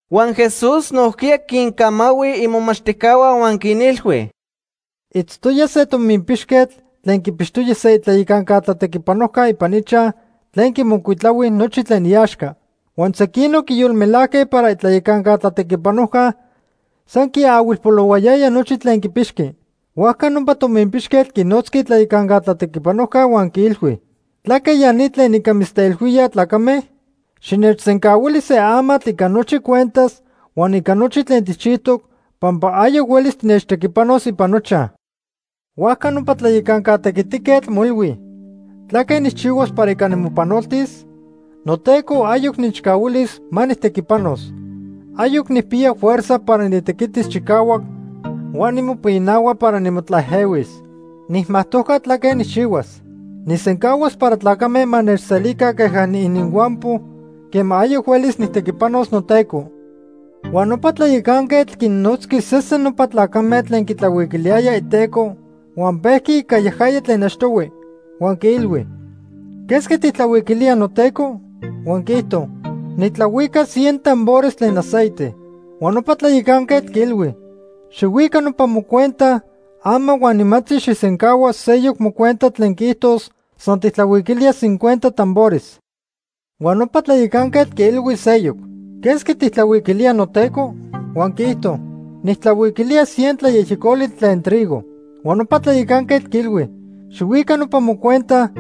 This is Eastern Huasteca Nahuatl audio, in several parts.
Huan Jesús nojquiya quincamahui imomachtijcahua huan quinilhui: “Itztoya se tominpixquetl tlen quipixtoya se itlayacanca tlatequipanojca ipan ichaj tlen quimocuitlahui nochi tlen iaxca. Huan sequinoc quiyolmelajque para itlayacanca tlatequipanojca san quiahuilpolohuayaya nochi tlen quipixqui. Huajca nopa tominpixquetl quinotzqui itlayacanca tlatequipanojca huan quiilhui: ‘¿Tlaque ya ni tlen ica mitzteilhuíaj tlacame? Xinechsencahuili se amatl ica nochi cuentas huan ica nochi tlen tijchijtoc pampa ayoc huelis tinechtequipanos ipan nochaj.’ “Huajca nopa tlayacanca tequitiquetl moilhui: ‘¿Tlaque nijchihuas para ica nimopanoltis? Noteco ayoc nechcahuilis ma nijtequipanos. Ayoc nijpiya fuerza para nitequitis chicahuac huan nimopinahua para nimotlaejehuis. Nijmajtojca tlaque nijchihuas. Nijsencahuas para tlacame ma nechselica queja niininhuampo quema ayoc huelis nijtequipanos noteco.’ “Huan nopa tlayacanquetl quinnotzqui sesen nopa tlacame tlen quitlahuiquiliyayaj iteco huan pejqui ica yajaya tlen achtohui. Huan quiilhui: ‘¿Quesqui tijtlahuiquilía noteco?’ Huan quiijto: ‘Nitlahuica cien tambores tlen aceite.’ Huan nopa tlayacanquetl quiilhui: ‘Xijhuica nopa mocuenta ama huan nimantzi xijsencahua seyoc mocuenta tlen quiijtos san tijtlahuiquilía cincuenta tambores.’ Huan nopa tlayacanquetl quiilhui seyoc: ‘¿Quesqui tijtlahuiquilía noteco?’ Huan quiijto: ‘Nijtlahuiquilía cien tlayejyecoli tlen trigo.’ Huan nopa tlayacanquetl quiilhui: ‘Xijhuica nopa mocuenta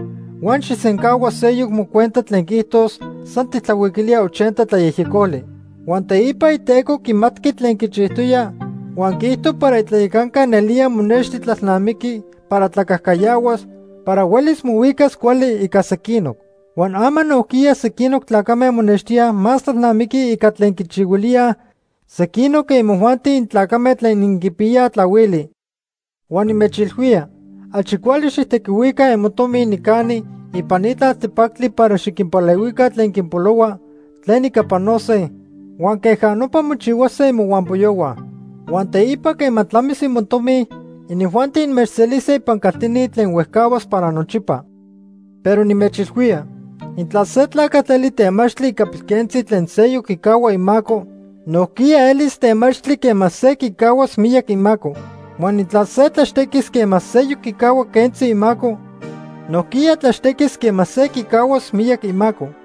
huan xijsencahua seyoc mocuenta tlen quiijtos san tijtlahuiquilía ochenta tlayejyecoli.’ Huan teipa iteco quimatqui tlen quichijtoya huan quiijto para itlayacanca nelía monexti tlalnamiqui para tlacajcayahuas para huelis mohuicas cuali ica sequinoc. Huan ama nojquiya sequinoc tlacame monextíaj más tlalnamiquij ica tlen quichihuilíaj sequinoc que imojuanti intlacame tlen inquipiyaj tlahuili. “Huan nimechilhuía achi cuali xijtequihuica imotomi nicani ipan ni tlaltepactli para xiquinpalehuica tlen quinpolohuaj tlen ica panose huan queja nopa mochihuase imohuampoyohua. Huan teipa quema tlamis imotomi, inijuanti inmechselise ipan caltini tlen huejcahuas para nochipa. “Pero nimechilhuía intla se tlacatl eli temachtli ica pilquentzi tlen seyoc quicahua imaco, nojquiya elis temachtli quema se quicahuas miyac imaco. Huan intla se tlaxtequis quema seyoc quicahua quentzi imaco, nojquiya tlaxtequis quema se quicahuas miyac imaco.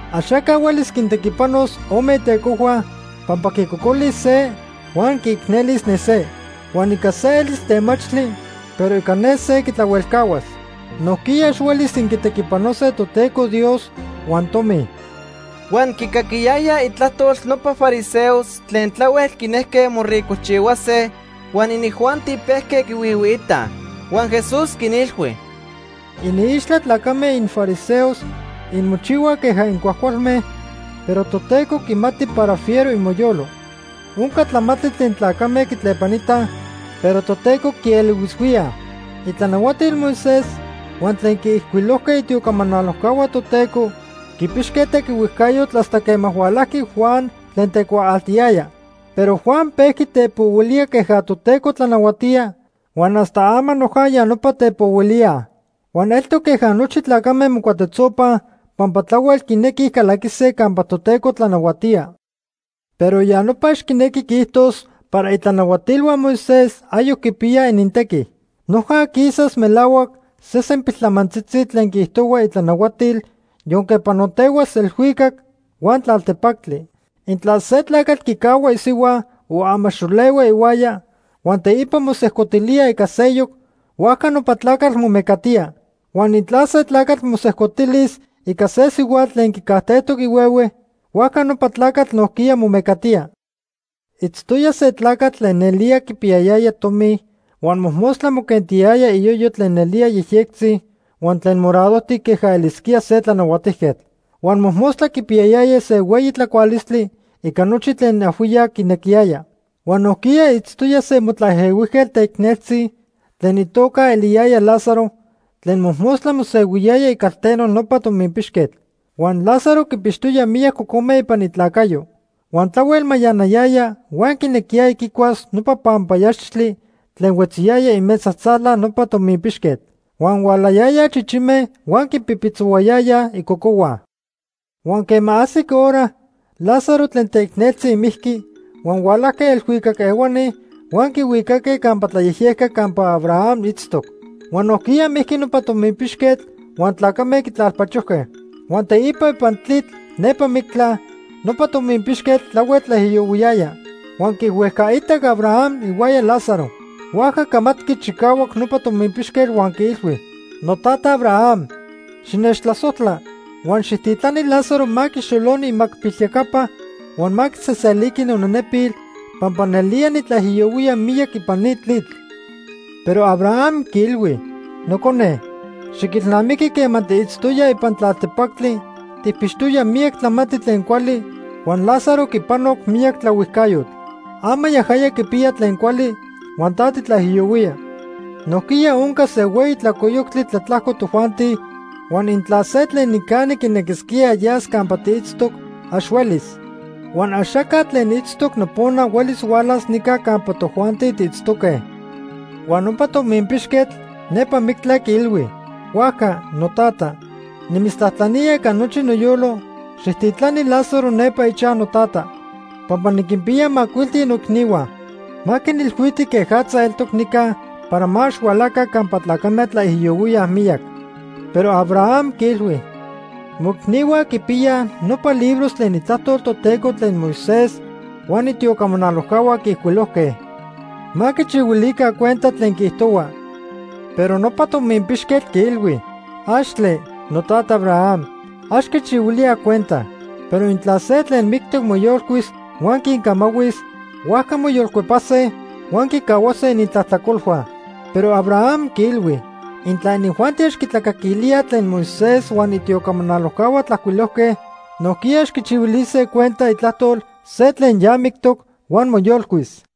“Axaca huelis quintequipanos ome itecojhua pampa quicocolis se huan quiicnelis ne se. Huan ica se elis temachtli, pero ica ne se quitlahuelcahuas. Nojquiya ax huelis inquitequipanose Toteco Dios huan tomi.” Huan quicaquiyayaj itlajtol nopa fariseos tlen tlahuel quinejque moricojchihuase huan inijuanti pejque quihuihuiitaj. Huan Jesús quinilhui: “Iniixtla tlacame infariseos inmochihuaj queja incuajcualme, pero Toteco quimati para fiero imoyolo. Onca tlamantli tlen tlacame quitlepanitaj, pero Toteco quielihuishuía. “Itlanahuatil Moisés huan tlen quiijcuilojque itiocamanalojcahua Toteco quipixque tequihuejcayotl hasta quema hualajqui Juan tlen tecuaaltiyaya. Pero Juan pejqui tepohuilía queja Toteco tlanahuatía huan hasta ama noja ya nopa tepohuilíaj. Huan eltoc queja nochi tlacame mocuatetzopaj pampa tlahuel quinequij calaquise campa Toteco tlanahuatía. “Pero ya nopa ax quinequi quiijtos para itlanahuatilhua Moisés ayoc quipiya inintequi. Noja quisas melahuac sesen piltlamantzitzi tlen quiijtohua itlanahuatil yonque panotehuas elhuicac huan tlaltepactli. “Intla se tlacatl quicahua isihua o amaxolehua ihuaya huan teipa mosejcotilía ica seyoc, huajca nopa tlacatl momecatía. Huan intla se tlacatl mosejcotilis ica se sihuatl tlen quicajtejtoc ihuehue, huajca nopa tlacatl nojquiya momecatía. “Itztoya se tlacatl tlen nelía quipiyayaya tomi huan mojmostla moquentiyaya iyoyo tlen nelía yejyectzi huan tlen moradojtic queja elisquía se tlanahuatijquetl. Huan mojmostla quipiyayaya se hueyi tlacualistli ica nochi tlen ajhuiyac quinequiyaya. Huan nojquiya itztoya se motlaejehuijquetl teicneltzi tlen itoca eliyaya Lázaro tlen mojmostla mosehuiyaya icalteno nopa tominpixquetl. Huan Lázaro quipixtoya miyac cocome ipan itlacayo. Huan tlahuel mayanayaya huan quinequiyaya quicuas nopa panpayaxtli tlen huetziyaya imesa tzala nopa tominpixquetl. Huan hualayayaj chichime huan quipipitzohuayayaj icocohua. Huan quema ajsic hora, Lázaro tlen teicneltzi mijqui huan hualajque elhuicac ehuani huan quihuicaque campa tlayejyejca campa Abraham itztoc. Huan nojquiya mijqui nopa tominpixquetl huan tlacame quitlalpachojque. Huan teipa ipan tlitl nepa mictla, nopa tominpixquetl tlahuel tlaijiyohuiyaya. Huan quihuejcaitac Abraham ihuaya Lázaro. Huajca camatqui chicahuac nopa tominpixquetl huan quiilhui: ‘Notata Abraham, xinechtlasojtla, huan xijtitlani Lázaro ma quixoloni imacpilyacapa huan ma quiseseliqui nonenepil pampa nelnelía nitlaijiyohuía miyac ipan ni tlitl.’ Pero Abraham quiilhui: ‘Nocone, xiquilnamiqui quema tiitztoya ipan tlaltepactli tijpixtoya miyac tlamantli tlen cuali huan Lázaro quipanoc miyac tlaohuijcayotl. Ama yajaya quipiya tlen cuali huan ta titlaijiyohuía. Nojquiya onca se hueyi tlalcoyoctli tlatlajco tojuanti huan intla se tlen nicani quinequisquía yas campa tiitztoc, ax huelis. Huan axaca tlen itztoc nopona huelis hualas nica campa tojuanti tiitztoque.’ “Huan nopa tominpixquetl nepa mictla quiilhui: ‘Huajca, notata, nimitztlajtlanía ica nochi noyolo, xijtitlani Lázaro nepa ichaj notata. Pampa niquinpiya macuilti noicnihua. Ma quinilhuiti quejatza eltoc nica para ma ax hualaca campa tlacame tlaijiyohuíaj miyac.’ Pero Abraham quiilhui: ‘Moicnihua quipiyaj nopa libros tlen Itlajtol Toteco tlen Moisés huan itiocamanalojcahua quiijcuilojque. Ma quichihuilica cuenta tlen quiijtohua.’ Pero nopa tominpixquetl quiilhui: ‘¡Axtle! Notata Abraham, ax quichihuilíaj cuenta. Pero intla se tlen mictoc moyolcuis huan quincamahuis, huajca moyolcuepase huan quicahuase inintlajtlacolhua.’ Pero Abraham quiilhui: ‘Intla inijuanti ax quitlacaquilíaj tlen Moisés huan itiocamanalojcahua tlajcuilojque, nojquiya ax quichihuilise cuenta itlajtol se tlen ya mictoc huan moyolcuis.’”